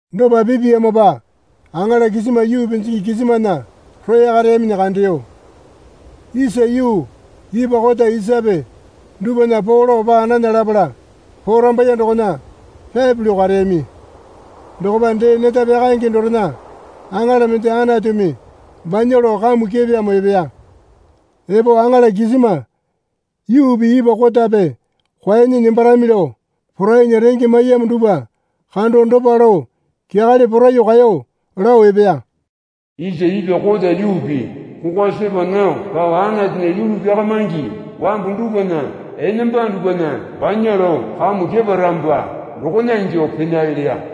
Dopa pepeyamopa aŋala kisima yuu pinjingi kisimana roya kareyaminyi kandeyo. Isa yuu ipwa kota isape dupwana poo lao paa nana lapala porambaiye dokona pyapi lao kareyami. Dokopa dee neta pyakaenge dorena aŋala mende Anatumi banya lao kamu kepeyamo epeya. Epo aŋala kisima yuupi ipwa kotape kwuanyi nembarami lao porainya renge maiyamo dupwa kando dopa lao kyakale poraiyuo kaeyo lao epeya. Isa ipwa kota yuupi kokwa sepa nao pao Anatunya yulu pyakamaingi wambu dupwana enamba dupwana banya lao kamu keparamopa dokona ingyuo penale leya.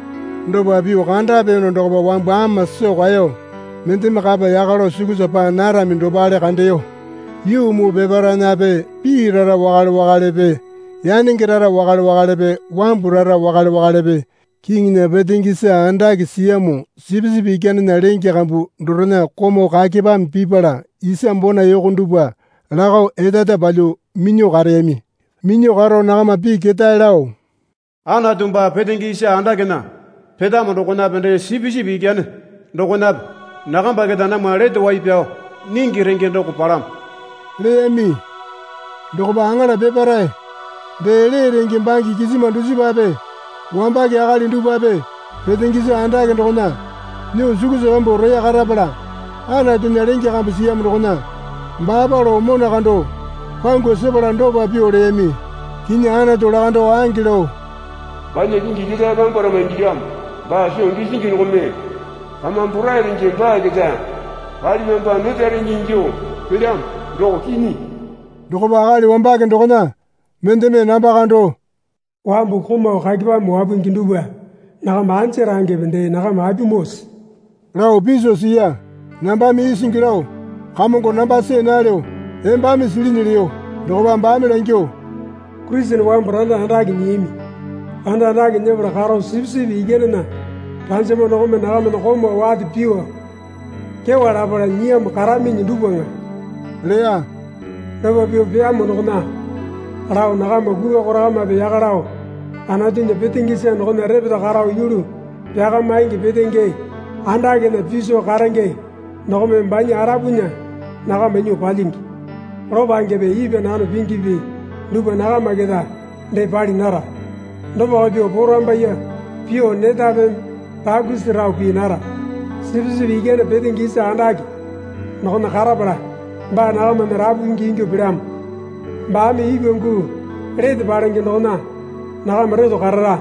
Dopa pyuo kandapeyono dokopa wambu ama soo kaeyo, mendeme kapa yaka lao sukusa paa narami dopale kandeyo. Yuu muu peparaenape pii rara wakale wakalepe yanenge rara wakale wakalepe wambu rara wakale wakalepe kiŋinya petenge isa andake siyamo Sipisipi Ikyanena lenge kambu dorena komau kakepame pipala isa bona yoko dupwa lakao eta eta palyuo minyuo kareyami. Minyuo karo nakama pii ketae lao, Anatu baa petenge isa andakena petamo dokonape dee Sipisipi Ikyane dokonape nakamba keta namwa lete wai pyao nyingi renge doko palamo leyami. Dokopa aŋala peparae, dee lee renge bange kisima dusipape wambake akali dupwape petenge isa andake dokona nyuo sukusa pyambuo roya karapala Anatunya lenge kambu siyamo dokona baapa lao mona kando pangu sepala dopa pyuo leyami. Kinyi Anatu lakando ange lao banya kingi ketae pyambwarama ingilyamo. Baa soo gisingi dokome kamame porai renge baa keta palipyamopa neta renge ingyuo pelyamo, doko kinyi. Dokopa akali wambake dokona mendeme namba kando, Wambu komau kakepame wapungi dupwa nakama anja rangepe dee nakama apimoose lao piso siya. Nambame isingi lao, Kamongo namba see nalyo, embame silinyi leyo. Dokopa baame langyuo, Kurisene wambu randa andake nyiyami. Randa andake nyepala karo Sipisipi Ikyanena ranjama dokome nakamana komau wate pyuo kyewa lapala nyiyamo karaminyi dupwaŋa leya. Dopa pyuo peyamo dokona lao nakama kukwa korakamape yaka lao Anatunya petenge isa dokona repeta karo yulu pyakamaingi petenge andakena piso karenge dokome banya arapunya nakama nyuo palyingi. Lopangepe ipwa nano pingipi dupwa nakama keta dee pali nara. Dopako pyuo porambaiye pyuo netapeme rakusi rao pii nara. Sipisipi Ikyane petenge isa andake dokona karapala baa nakamana rapu pingi ingyuo pelyamo. Baame ipwa guu lete palenge dokona nakama reto karara.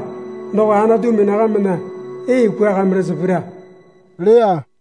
Doko Anatumi nakamana ee kwuakamirasa pira leya.